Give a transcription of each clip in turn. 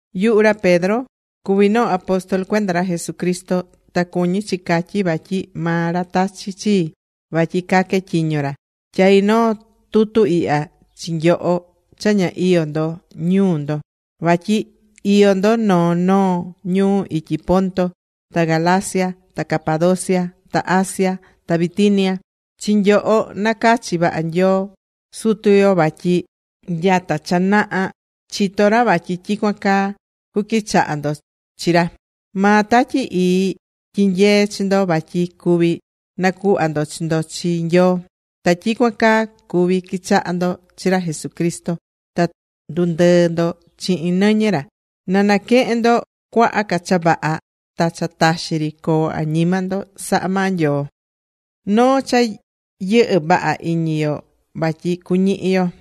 Yuhu ra Pedro cuví noo apóstol cuenda ra Jesucristo, ta cuñí chi catyí, vatyi maa ra tachi̱ chii vatyi caque tyiño ra. Tyaí noo tutu ihya chi nyoho cha ña iyó ndo ñuu ndo, vatyi iyó ndo noo noo ñuu ityi Ponto, ta Galacia, ta Capadocia, ta Asia ta Bitinia. Chi nyoho nacachi̱ vaha maa Nyoo Sutu yo vatyi nyata cha naha chito̱ ra vatyi tyicuan caa cuquichaha ndo chi ra. Maa Tatyi Ii tyinyee̱ chi ndo vatyi cuví nacuhva ndo chi ndo chi Nyoo, ta tyicuan caa cuví quichaha ndo chi ra Jesucristo, ta ndundɨɨ́ ndo chihin nɨñɨ ra. Na naquehen ndo cuaha ca cha vaha ta cha taxi ri coo añima ndo sahá maa Nyoo.Noo cha yɨhɨ́ vaha iñi yo vatyi cuñihi yo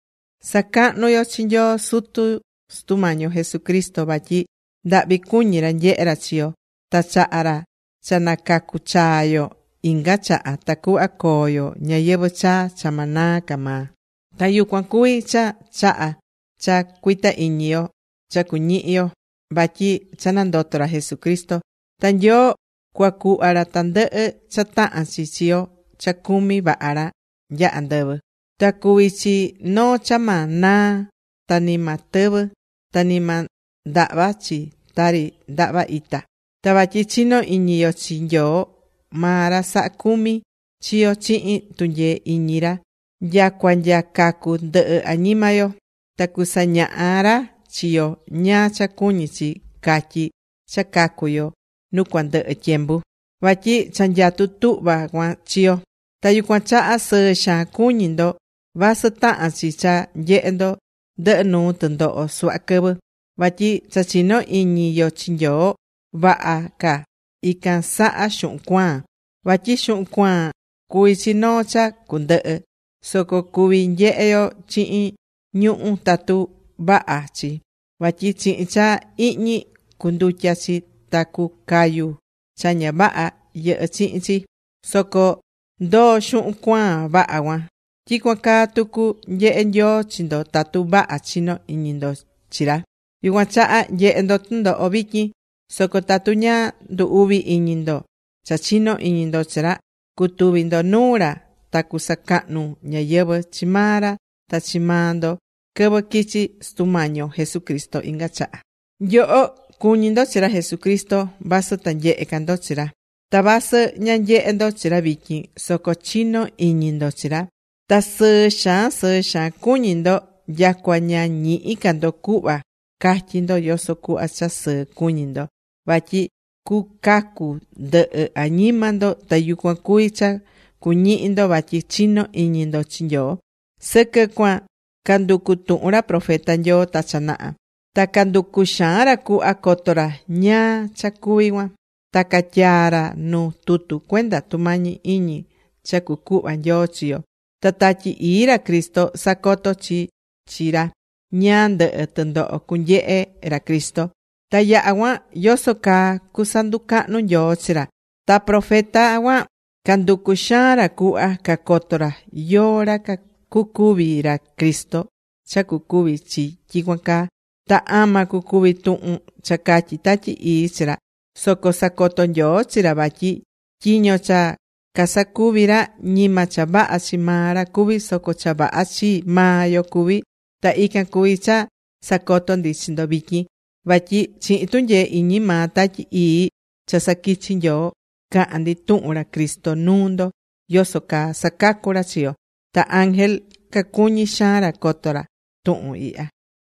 Sa̱cahnu yo chi Nyoo Sutu Sutu Mañi yo Jesucristo vatyi ndahvi cuñí ra nyehé ra chi yo ta chahá ra cha nacacu chaa yo inga chaha tacuhva coo yo ñayɨvɨ̱ chaa cha ma naa ca maa. Ta yucuan cuví cha chaha̱ cha cuita iñi yo cha cuñihi yo vatyi cha nandoto̱ ra Jesucristo. Ta Nyoo cuacuhva ra tandɨhɨ cha tahán chi chi yo cha cumí vaha ra nya andɨvɨ. Ta cuví chi noo cha ma naa ta ni ma tɨvɨ, ta ni ma ndahva chi tari ndahva ita. Ta vatyi chinó iñi yo chi Nyoo maa ra sahá cumi chi yo chihin tunyee iñi ra nyacua nya cacu ndɨhɨ añima yo. Ta cusañaha ra chi yo ñáá cha cuñi chi catyi cha cacú yo nu cuandɨhɨ tyembu. Vatyi cha nyatú tuhva cuan chi yo. Ta yucuan chaha sɨɨ xaan cuñí ndo, vasɨ tahán chi cha nyehé ndo ndɨhɨ nuu tɨndoho suhva quɨvɨ. Vatyi cha chinó iñi yo chi Nyoo, vaha ca ican saha xuhun cuaan. Vatyi xuhun cuaan cuví chi noo cha cundɨhɨ. Soco cuví nyehe yo chihin ñuhu̱ tatu vaha chi, vatyi chihin cha ihñi cundutya chi ta cucayu cha ña vaha yɨhɨ́ chihin chi. Soco ndoó xuhun cuaan vaha cuan. Tyicuan caa tucu nyehé Nyoo chi ndo tatu vaha chinó iñi ndo chi ra. Yucuan chaha nyehé ndo tɨndoho vityin. Soco tatu ña ndu uví iñi ndo cha chinó iñi ndo chi ra, cutuvi ndo nuu ra ta cusacahnu ñáyɨvɨ chi maa ra ta chi maa ndo quɨvɨ quichi Sutu Mañi yo Jesucristo inga chaha. Nyoho cuñí ndo chi ra Jesucristo vasɨ ta nyehe ca ndo chi ra. Ta vasɨ ña nyehé ndo chi ra vityin, soco chinó iñi ndo chi ra, ta sɨɨ xaan sɨɨ xaan cuñí ndo nyacua ña ñihí ca ndo cuhva catyí ndo yoso cuhva cha sɨɨ cuñí ndo. Vatyi cucacu ndɨhɨ añima ndo ta yucuan cuví cha cuñihi ndo vatyi chinó iñi ndo chi Nyoo. Sɨquɨ cuan canducu̱ tuhun ra profeta Nyoo ta cha naha. Ta canducu̱ xaan ra cuhva coto ra ñáá cha cuví cuan. Ta catyaa̱ ra nu tutu cuenda tumañi iñi cha cucuhva Nyoo chi yo. Ta Tatyi Ii ra Cristo sacoto̱ chi chi ra ñáá ndɨhɨ tɨndoho cunyehe ra Cristo, ta yaha cuan yoso caa cusanducahnu Nyoo chi ra. Ta profeta cuan canducu̱ xaan ra cuhva cacoto ra yóó ra cucuvi ra Cristo cha cucuvi chi tyicuan caa, ta ama cucuvi tuhun cha catyi̱ Tatyi Ii chi ra. Soco sacoto̱ Nyoo chi ra vatyi tyiño cha casacuví ra, ñima cha vaha chi maa ra cuví, soco cha vaha chi maa yo cuví. Ta ican cuví cha sacotó ndi chi ndo vityin. Vatyi chihin tunyee iñi maa Tatyi Ii cha saquichi̱ Nyoo, caha̱n ndi tuhun ra Cristo nuu ndo yoso caa sacacú ra chi yo. Ta ángel cacuñí xaan ra cacoto ra tuhun ihya.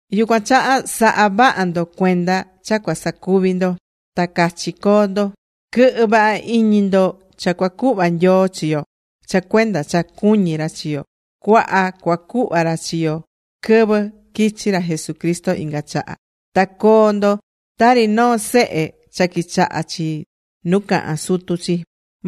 Yucuan chaha sa̱ha vaha ndo cuenda cha cua sacuvi ndo, ta cachi co̱o ndo. Quɨ̱hɨ vaha iñi ndo cha cuacuhva Nyoo chi yo cha cuenda cha cuñí ra chi yo. Cuaha cuacuhva ra chi yo quɨvɨ quichi ra Jesucristo inga chaha. Ta co̱o ndo tari noo sehe cha quichahá chi nu cahán sutu chi.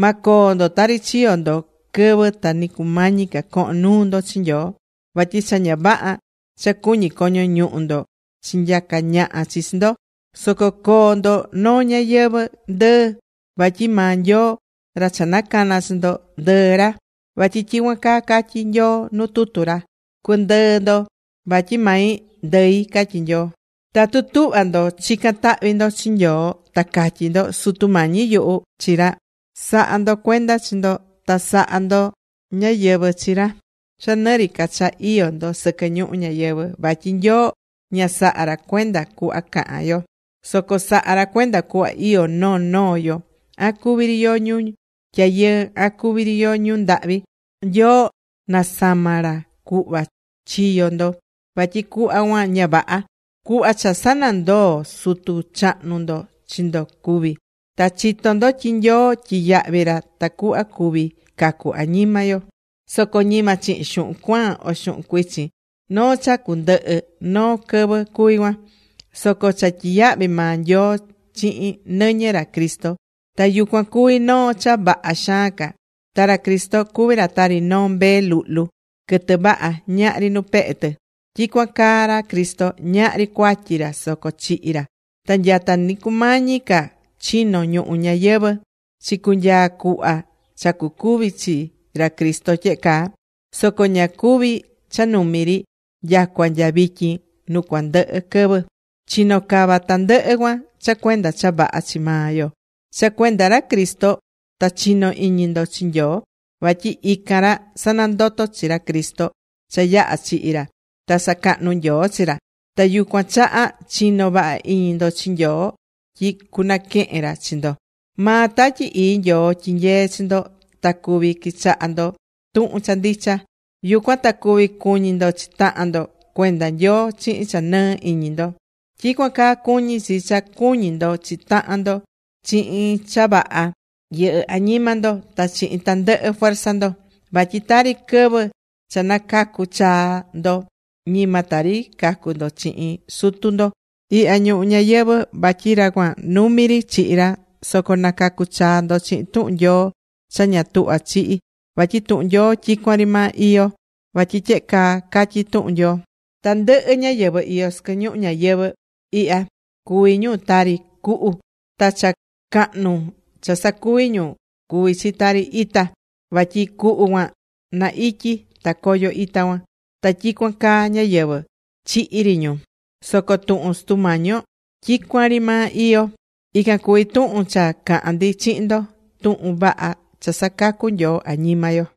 Ma coo ndo tari chiyo̱ ndo quɨvɨ ta ni cumañi ca cohon nuu ndo chi Nyoo. Vatyi cha ña vaha cha cuñí coño ñuhu ndo chinyaca̱ ñaha chi chi ndo. Soco co̱o ndo noo ñayɨvɨ̱ ndɨɨ, vatyi maa Nyoo, ra cha nacana̱ chi ndo, ndɨɨ ra. Vatyi tyicuan caa catyí Nyoo nu tutu ra. “Cu̱ndɨɨ ndo vatyi mai ndɨi”, catyí Nyoo. Tatu tuhvá ndo chicán tahvi ndo chi Nyoo ta catyí ndo “Sutu Mañi yuhu” chi ra, sa̱ha ndo cuenda chi ndo ta sa̱ha ndo ñáyɨvɨ chi ra cha nɨ ri ca cha iyó ndo sɨquɨ ñuhu ñayɨvɨ̱. Vatyi Nyoo ña sahá ra cuenda cuhva cahán yo. Soco sahá ra cuenda cuhva iyó noo noo yo, an cuvi ri yo ñu tyayɨɨ, an cuví ri yo ñu ndahvi. Nyoo nasama̱ ra cuhva chiyo̱ ndo, vatyi cuhva cuan ña vaha, Cuhva cha sanandoo̱ Sutu chahnu ndo chi ndo cuví. Ta chitó ndo tyi Nyoo tyiyahvi̱ ra tacuhva cuvi cacu añima yo. Soco ñima chihin xuhun cuaan o xuhun cuichin. Noo cha cundɨhɨ noo quɨvɨ cuví cuan. Soco cha tyiyahvi̱ maa Nyoo chihin nɨñɨ ra Cristo. Ta yucuan cuvi noo cha vaha xaan ca. Ta ra Cristo cuví ra tari noo mbee luhlu quɨtɨ vaha, ñahri nu pehe tɨ, tyicuan caa ra Cristo, ñahri cuatyi ra soco chihi̱ ra. Ta nyata ni cumañi ca chino ñuhu ñayɨvɨ̱ chicunyaa cuhva cha cucuvi chi ra Cristo tyehe caa. Soco ña cuvi̱ cha numi ri. Nyacua nya vityin nu cuandɨhɨ quɨvɨ, chino̱ cava tandɨhɨ cuan cha cuenda cha vaha chi maa yo. Cha cuenda ra Cristo ta chinó iñi ndo chi Nyoo. Vatyi ican ra sanandoto̱ chi ra Cristo cha yaha̱ chihi̱ ra. Ta sacahnu̱ Nyoo chi ra. Ta yucuan chaha chinó vaha iñi ndo chi Nyoo tyi cunaquehen ra chi ndo. Maa Tatyi Ii Nyoo tyinyeé chi ndo ta cuví quichahá ndo tuhun cha ndicha. Yucuan ta cuví cuñi ndo chi tahan ndo cuenda Nyoo chihin cha nɨɨ iñi ndo. Tyicuan caa cuñí chi cha cu̱ñi ndo chi tahan ndo chihin cha vaha yɨhɨ́ añima ndo ta chihin tandɨhɨ fuerza ndo. Vatyi tari quɨvɨ cha nacacu̱ chaa ndo, ñima tari cacu ndo chihin sutu ndo ihya ñuhu ñayɨvɨ̱, vatyi ra cuan numi ri chihi ra, soco nacacu̱ chaa ndo chihin tuhun Nyoo cha ña tuhvá chihí vatyi tuhun Nyoo tyicuan ri maa iyó. Vatyi tyehe caa catyí tuhun Nyoo: Tandɨhɨ ñáyɨvɨ iyó sɨquɨ ñuhu ñayɨvɨ̱ ihya cuví ñu tari cuhu. Ta cha cahnu cha sacuví ñu cuví chi tari ita. Vatyi cuhu cuan na ityi, ta coyo ita cuan. (Ta tyicuan caa ñáyɨvɨ, chihí ri ñu.) Soco tuhun Sutu Mañi yo tyicuan ri maa iyó. Ican cuví tuhun cha caha̱n ndi chihin ndo: tuhun vaha cha sacacú Nyoo añima yo.